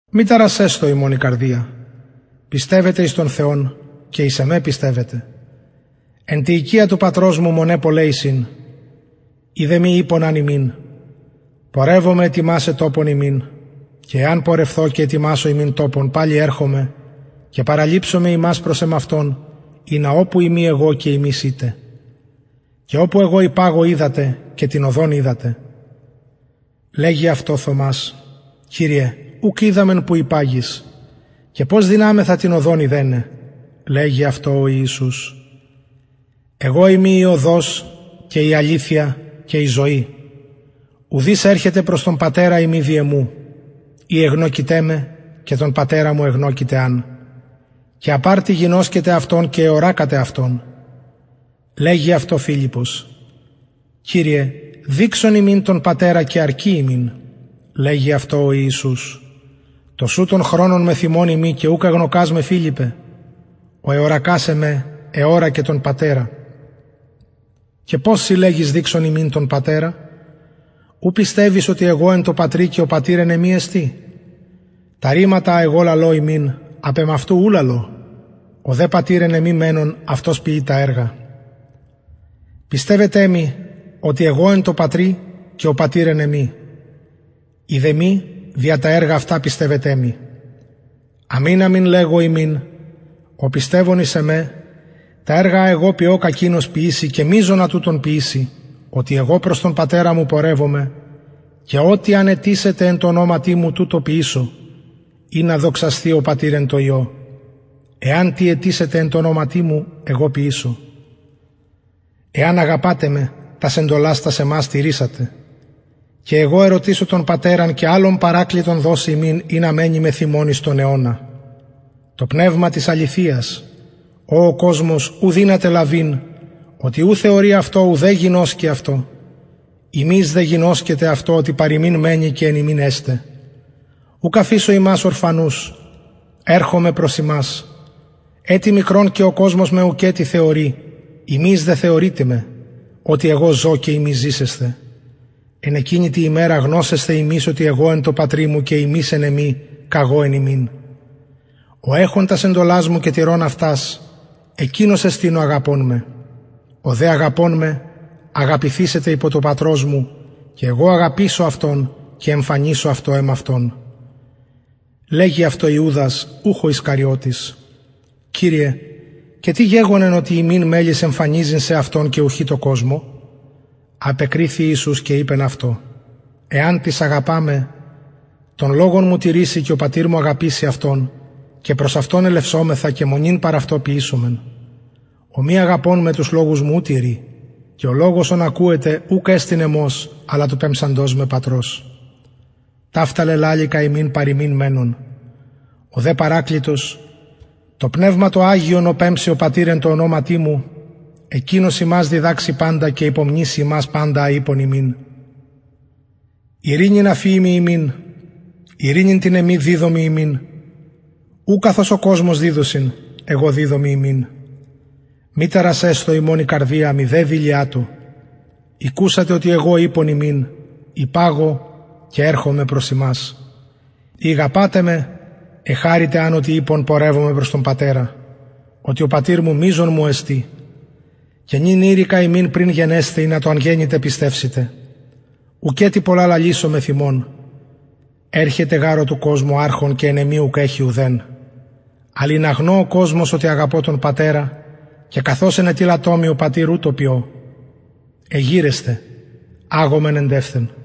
μη ταρασσεσθω υμων η καρδια πιστευετε εις τον θεον και εις εμε πιστευετε εν τη οικια του πατρος μου μοναι πολλαι εισιν ει δε μη ειπον αν υμιν πορευομαι ετοιμασαι τοπον υμιν και εαν πορευθω ετοιμασω υμιν τοπον παλιν ερχομαι και παραληψομαι υμας προς εμαυτον ινα οπου ειμι εγω και υμεις ητε και οπου εγω υπαγω οιδατε και την οδον οιδατε λεγει αυτω θωμας κυριε ουκ οιδαμεν που υπαγεις και πως δυναμεθα την οδον ειδεναι λεγει αυτω ο ιησους εγω ειμι η οδος και η αληθεια και η ζωη ουδεις ερχεται προς τον πατερα ει μη δι εμου ει εγνωκειτε με και τον πατερα μου εγνωκειτε αν και απ αρτι γινωσκετε αυτον και εωρακατε αυτον λεγει αυτω φιλιππος κυριε δειξον ημιν τον πατερα και αρκει ημιν λεγει αυτω ο ιησους τοσουτον χρονον μεθ υμων ειμι και ουκ εγνωκας με φιλιππε ο εωρακως εμε εωρακεν τον πατερα και πως συ λεγεις δειξον ημιν τον πατερα ου πιστευεις οτι εγω εν τω πατρι και ο πατηρ εν εμοι εστιν τα ρηματα α εγω λαλω υμιν απ εμαυτου ου λαλω ο δε πατηρ ο εν εμοι μενων αυτος ποιει τα εργα πιστευετε μοι οτι εγω εν τω πατρι και ο πατηρ εν εμοι ει δε μη δια τα εργα αυτα πιστευετε μοι αμην αμην λεγω υμιν ο πιστευων εις εμε τα εργα α εγω ποιω κακεινος ποιησει και μειζονα τουτων ποιησει οτι εγω προς τον πατερα μου πορευομαι και ο τι αν αιτησητε εν τω ονοματι μου τουτο ποιησω ινα δοξασθη ο πατηρ εν τω υιω εαν τι αιτησητε με εν τω ονοματι μου εγω ποιησω εαν αγαπατε με τας εντολας τας εμας τηρησατε και εγω ερωτησω τον πατερα και αλλον παρακλητον δωσει υμιν ινα μενη μεθ υμων εις τον αιωνα το πνευμα της αληθειας ο ο κοσμος ου δυναται λαβειν οτι ου θεωρει αυτο ουδε γινωσκει αυτο υμεις δε γινωσκετε αυτο οτι παρ υμιν μενει και εν υμιν εσται ουκ αφησω υμας ορφανους ερχομαι προς υμας ετι μικρον και ο κοσμος με ουκετι θεωρει υμεις δε θεωρειτε με οτι εγω ζω και υμεις ζησεσθε εν εκεινη τη ημερα γνωσεσθε υμεις οτι εγω εν τω πατρι μου και υμεις εν εμοι και εγω εν υμιν ο εχων τας εντολας μου και τηρων αυτας εκεινος εστιν ο αγαπων με ο δε αγαπων με αγαπηθησεται υπο του πατρος μου και εγω αγαπησω αυτον και εμφανισω αυτω εμαυτον λεγει αυτω ιουδας ουχ ο ισκαριωτης κυριε και τι γεγονεν οτι ημιν μελλεις εμφανιζειν σεαυτον και ουχι τω κοσμω απεκριθη ιησους και ειπεν αυτω εαν τις αγαπα με τον λογον μου τηρησει και ο πατηρ μου αγαπησει αυτον και προς αυτον ελευσομεθα και μονην παρ αυτω ποιησομεν ο μη αγαπων με τους λογους μου ου τηρει και ο λογος ον ακουετε ουκ εστιν εμος αλλα του πεμψαντος με πατρος ταυτα λελαληκα υμιν παρ υμιν μενων ο δε παρακλητος το πνευμα το αγιον ο πεμψει ο πατηρ εν τω ονοματι μου εκεινος υμας διδαξει παντα και υπομνησει υμας παντα α ειπον υμιν ειρηνην αφιημι υμιν ειρηνην την εμην διδωμι υμιν ου καθως ο κοσμος διδωσιν εγω διδωμι υμιν μη ταρασσεσθω υμων η καρδια μηδε δειλιατω ηκουσατε οτι εγω ειπον υμιν υπαγω και ερχομαι προς υμας ει ηγαπατε με εχαρητε αν οτι ειπον πορευομαι προς τον πατερα οτι ο πατηρ μου μειζων μου εστιν και νυν ειρηκα υμιν πριν γενεσθαι ινα οταν γενηται πιστευσητε ουκετι πολλα λαλησω μεθ υμων ερχεται γαρ ο του κοσμου αρχων και εν εμοι ουκ εχει ουδεν αλλ ινα γνω ο κοσμος οτι αγαπω τον πατερα και καθως ενετειλατο μοι ο πατηρ ουτως ποιω εγειρεσθε αγωμεν εντευθεν